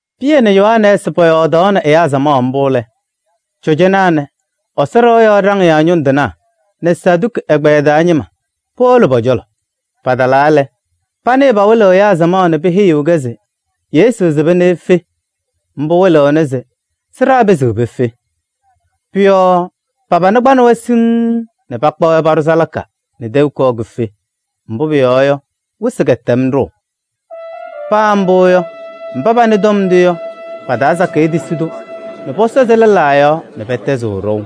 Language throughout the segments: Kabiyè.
Pɩyɛ nɛ Yohanɛɛsɩ pɔyɔɔdaɣnɩ ɛyaa samaɣ mbʋ lɛ, cɔjɔnaa nɛ Ɛsɔ ɖɩɣa yɔɔ ɖaŋɩyaa ñʋŋ tɩnaa nɛ Saduki ɛgbɛyɛ taa ñɩma powolo pɔ-cɔlɔ. Patalaa lɛ, panɩɩ pawɩlɩɣ ɛyaa samaɣ nɛ peheyiɣ-kɛ se Yesu sɩba nɛ efe, mbʋ wɩlɩɣnɩ se sɩɖaa pɩzɩɣ pefe. Pʋ-yɔɔ pa-pana kpanɩ-wɛ siŋŋ nɛ pakpa-wɛ paɖʋ salaka nɛ tɛʋ kɔɔ kife. Mbʋ pʋyɔɔ yɔ, wɩsɩ kɛtɛm ɖʋʋ. Paa mbʋ yɔ, mba panɩ tɔm ndʋ yɔ, pa-taa sakɩyɛ tisi-tʋ nɛ pɔsɔzɩ lɛlaa yɔɔ nɛ pɛtɛzɩ ɖɔʋ.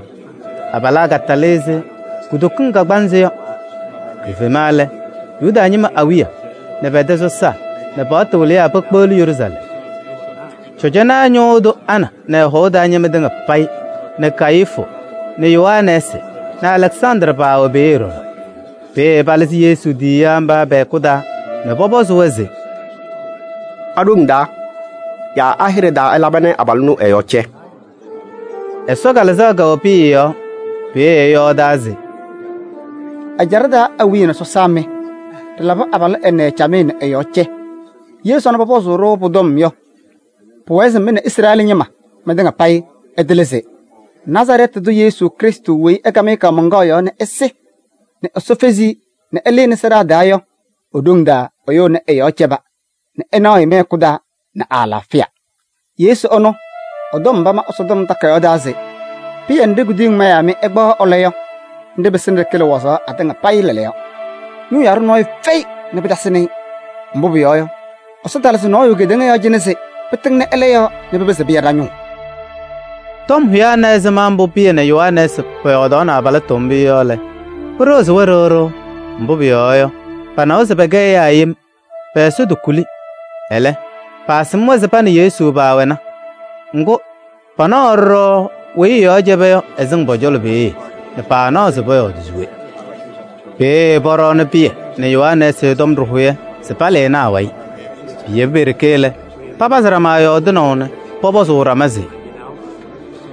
Abalaa katalɩ ɛzɩ kutokiŋ kagbaanzɩ yɔ. Kifema lɛ, Yuda ñɩma awiya nɛ pɛ-tɛ sɔsaa nɛ paɣtʋ wɩlɩyaa pekpeɣli Yeruusalɛm. Cɔjɔnaa ñʋʋ tʋ Ana nɛ ɛ-hɔʋ taa ñɩma tɩŋa payɩ nɛ Kayifu nɛ Yohanɛɛsɩ nɛ Alɛksandrɩ paawɛ peeye ɖɔɖɔ. Peeye palɩzɩ Yesu tiyiyaa mba pɛ-hɛkʋ taa nɛ pɔpɔzɩ-wɛ se: “A-ɖoŋ taa yaa a-hɩɖɛ taa ɩlaba nɛ abalʋ ɛnʋ ɛ-yɔɔ cɛ?” Ɛsɔ Kalɩzaɣ kɛwɛ Pɩyɛ yɔɔ, peeye ɛyɔɔdaa se: “Ɛjaɖɛ taa awiya nɛ sɔsaa mɩ! Ɖɩlabɩ abalʋ ɛnɛ camɩyɛ nɛ ɛ-yɔɔ cɛ. Ye sɔnɔ pɔpɔzʋʋ-ɖʋ pʋ-tɔm yɔ, pʋwɛɛ se mɩ nɛ Izrɛɛlɩ ñɩma, mɩtɩŋa payɩ ɩtɩlɩ se: Nazarɛɛtɩ tʋ Yesu Krɩstʋ weyi ɩkam-ɩ kaamaŋkaɣ yɔɔ nɛ ɛsɩ nɛ Ɛsɔ fezi-i nɛ ɛlɩnɩ sɩɖaa taa yɔ, e-ɖoŋ taa ɛyʋ ɛnɛ ɛ-yɔɔ cɛba nɛ ɩnaɣ-ɩ mɩ-hɛkʋ taa nɛ ɛ-alaafɩya. Yesu ɛnʋ, ɛ-tɔm pama Ɛsɔtɔm Takayaɣ taa se: ‘Pɩyɛ nɖɩ kuduyiŋ mayaa mɩ ɩkpaɣaɣ ɩlɔ yɔ, nɖɩ pɩsɩnɩ ɖɩkɩlɩ wazaɣ atɩŋa payɩ lɛɛlɛɛyɔ.’ Ñʋʋ yaɖʋ nɔɔyʋ fɛyɩ nɛ pɩtasɩnɩ-ɩ. Mbʋ pʋyɔɔ yɔ, Ɛsɔ talɩzɩ nɔɔyʋ kedeŋa yɔɔ cɩnɛ se pɩtɩŋnɩ ɛlɛ yɔɔ nɛ pɩpɩzɩ pɩya ɖa-ñʋʋ.” Tɔm hʋyaa na ɛzɩma mbʋ Pɩyɛ nɛ Yohanɛɛsɩ pɔyɔɔdaɣnɩ abalɩtʋ mbʋ yɔ lɛ, pɩɖɩɣzɩ-wɛ ɖɩɣ ɖɩɣ. Mbʋ pʋyɔɔ yɔ, panawa se pɛkɛ ɛyaa yem, pɛ-ɛza tokuli. Ɛlɛ, paasɩm-wɛ se pa nɛ Yesu paawɛna. Ŋgʋ, panaɣaɣ ɖɔɖɔ weyi ɛ-yɔɔ cɛba yɔ, ɛsɩŋ pɔ-cɔlɔ peeye nɛ paanaɣ pɔyɔɔdɩ se we. Peeye pɔɖɔɔnɩ Pɩyɛ nɛ Yohanɛɛsɩ tɔm ɖɩhʋyɛ se palɩnɩ awayɩ. Piyebi pe-ɖeke lɛ, papazɩ ɖama yɔɔdɩnaʋ nɛ pɔpɔzʋʋ ɖama se: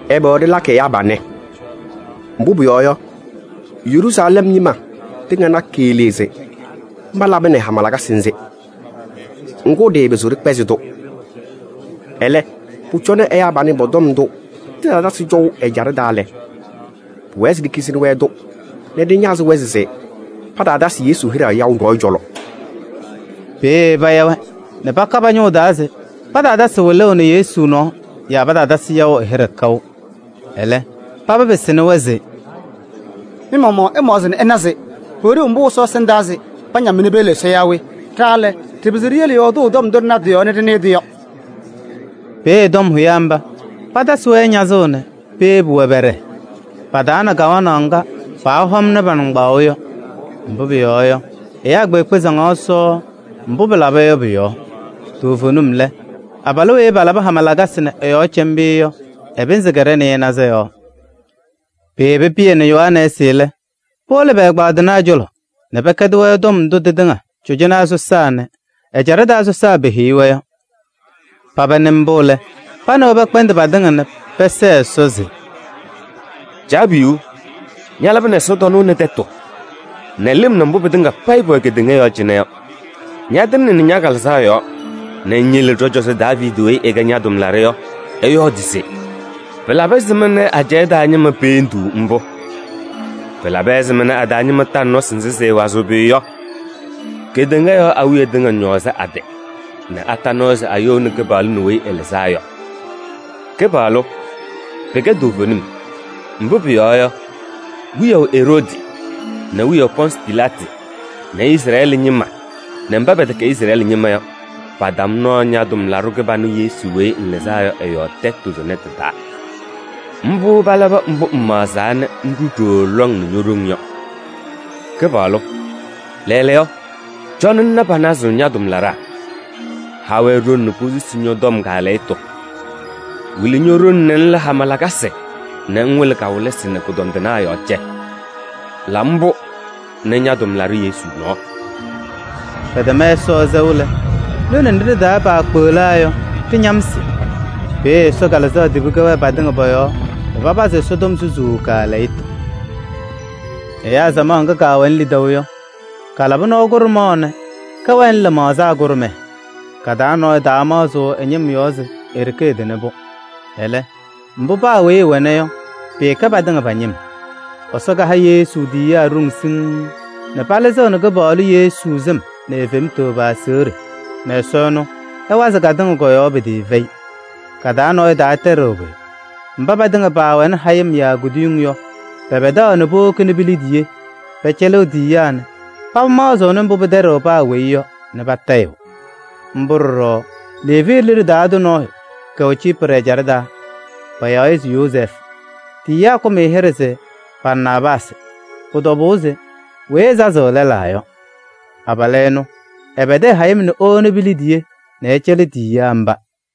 “Ɛbɛ ɖɩlakɩ ɛyaa panɛ? Mbʋ pʋyɔɔ yɔ, Yeruusalɛm ñɩma tɩŋa na keɣlee se mba labɩnɩ hama lakasɩ nzɩ. Ŋgʋ, ɖɩɩpɩzɩɣ ɖɩkpɛzɩ-tʋ. Ɛlɛ, pʋcɔ nɛ ɛyaa panɛ pɔ-tɔm ndʋ tɩtaatɛzɩ cɔʋ ɛjaɖɛ taa lɛ, pʋwɛɛ se ɖikizini-wɛ-tʋ nɛ ɖɩñazɩ-wɛ se pataatasɩ Yesu hɩɖɛ yaʋ nɔɔyʋ cɔlɔ.” Peeye paya-wɛ nɛ paka pa-ñʋŋ taa se pataatasɩ wɩlʋʋ nɛ Yesu nɔɔ yaa pataatasɩ yaʋ ɛ-hɩɖɛ kaʋ. Ɛlɛ, paba pɩsɩnɩ-wɛ se: “Mɩ-maɣmaɣ ɩmaɣzɩ nɛ ɩna se: pʋwɛ ɖeu mbʋ Ɛsɔ ɛsɩndaa se pañam-mɩ nɛ piyele Ɛsɔ yaa we? Ɖa lɛ, ɖɩɩpɩzɩɣ ɖiyele yɔɔdʋʋ tɔm ndʋ ɖɩna tɩ-yɔɔ nɛ ɖɩnɩɩ-tʋ yɔ.” Peeye tɔm hʋyaa mba patasɩ-wɛ ñazʋʋ nɛ peyebi-wɛ pɛɖɛɛ. Pataana kawanaɣ ŋga paahɔmnɩ pa-nɩŋgbaŋʋʋ yɔ. Mbʋ pʋyɔɔ yɔ, ɛyaa kpeekpe saŋaɣ Ɛsɔ mbʋ pɩlaba yɔ pʋ-yɔɔ. Toovenim lɛ, abalʋ weyi palabɩ hama lakasɩ nɛ ɛ-yɔɔ cɛ mbʋ yɔ, ɛ-pɩnzɩ kɛɖɛ nɩɩnaza yɔɔ. Peyebi Pɩyɛ nɛ Yohanɛɛsɩ lɛ, powolo pɛ-ɛgbaadɩnaa cɔlɔ nɛ pɛkɛdɩ-wɛ tɔm ndʋ tɩtɩŋa cɔjɔnaa sɔsaa nɛ ɛjaɖɛ taa sɔsaa peheyi-wɛ yɔ. Paba nɩ mbʋ lɛ, pa nɛ wɛ pɛkpɛndɩ patɩŋa nɛ pɛsɛɛ Ɛsɔ se: “Caabiyuu! Ñalabɩnɩ ɛsɔtɔnʋʋ nɛ tɛtʋ nɛ lɩm nɛ mbʋ pɩtɩŋa payɩ pʋwɛ kedeŋa yɔɔ cɩnɛ yɔ. Ñatɩŋnɩnɩ ña-Kalɩzaɣ yɔɔ nɛ ŋyele ɖɔ-cɔzɔ Daaviidi weyi ɛkɛ ña-tʋmlaɖʋ yɔ, ɛyɔɔdɩ se: ‘Pɩlabɩ ɛzɩma ajɛɛ taa ñɩma peendiɣ mbʋ? Pɩlabɩ ɛzɩma a-taa ñɩma taŋ nɔsɩ nzɩ sɩɩwazɩɣ pʋyʋ yɔ? Kedeŋa yɔɔ awiya tɩŋa ñɔɔzɩ a-tɩ nɛ ata nɔɔ se ayouni Kɩpaɣlʋ nɛ Weyi Ɛlɩzaa Yɔ.’ Kɩpaɣlʋ! Pɩkɛ toovenim, mbʋ pʋyɔɔ yɔ, wiyaʋ Eroodi nɛ wiyaʋ Pɔɔnsɩ Pilaatɩ nɛ Izrɛɛlɩ ñɩma nɛ mba pɛtɛkɛ Izrɛɛlɩ ñɩma yɔ, patam nɔɔ ña-tʋmlaɖʋ kɩbanʋ Yesu weyi ŋlɩzaa yɔ ɛ-yɔɔ tɛtʋ tʋnɛ tɩ-taa. Mbʋ palabɩ mbʋ ŋmaɣzaa nɛ ŋɖʋ ɖooo lɔŋ nɛ ño-ɖoŋ yɔ. Kɩpaɣlʋ! Lɛɛlɛɛyɔ, cɔnɩ ŋna panazʋʋ ña-tʋmlaɖaa. Ha-wɛ ɖoŋ nɛ posusi ñɔ-tɔm kaalɛyɩtʋ. Wɩlɩ ño-ɖoŋ nɛ ŋla hama lakasɩ nɛ ŋwɩlɩ kawɩlɩsɩ nɛ kʋdɔndɩnaa yɔɔ cɛ. La mbʋ nɛ ña-tʋmlaɖʋ Yesu nɔɔ.” Pɛtɛm Ɛsɔ sɛʋ lɛ, lone nɖɩ ɖɩ-taa paakpeɣlaa yɔ, ɖɩñamsɩ. Peeye Ɛsɔ Kalɩzaɣ tibi kɛwɛɛ patɩŋa pɔ-yɔɔ nɛ papazɩ Ɛsɔtɔm susuu kaalɛyɩtʋ. Ɛyaa samaɣ ŋga kaawɛnɩ lidaʋ yɔ, kaalabɩ nɔɔ kʋɖʋmaɣ nɛ kɛwɛnɩ lɩmaɣza kʋɖʋmɛɛ, ka-taa nɔɔyʋ taamaɣzɩɣ ɛ-ñɩm yɔɔ se e-ɖeke ɛtɩnɩ-pʋ. Ɛlɛ, mbʋ paa weyi ɛwɛna yɔ, pɩɩkɛ patɩŋa pa-ñɩm. Ɛsɔ kaha Yesu tiyiyaa ɖoŋ siŋŋ nɛ palɩzɩɣnɩ Kɩpaɣlʋ Yesu sɩm nɛ e-fem pa-aseɣɖe nɛ Ɛsɔ ɛnʋ ɛwazɩɣ katɩŋa kɔ-yɔɔ pɩtɩɩfɛyɩ. Ka-taa nɔɔyʋ taatɛɖɩɣ pʋyʋ: mba patɩŋa paawɛnɩ hayɩm yaa kuduyiŋ yɔ, pɛpɛdaɣ nɛ powokini pi-liidiye pɛcɛlɩɣ tiyiyaa nɛ paba maɣzɩɣnɩ mbʋ pɩtɛɖɩɣ paa weyi yɔ nɛ patayɩɣ. Mbʋ ɖɔɖɔ Leevi liɖe taa tʋ nɔɔyʋ kɛwɛ Ciiprɩ ɛjaɖɛ taa, payaɣ-ɩ se Yozɛɛfʋ. Tiyiyaa kakʋm-ɩ hɩɖɛ se Barnaabaasɩ. Pʋ-tɔbʋʋ se weyi ɛsazɩɣ lɛlaa yɔ. Abalʋ ɛnʋ, ɛpɛdɩ ɛ-hayɩm nɛ ewoni pi-liidiye nɛ ɛcɛlɩ tiyiyaa mba.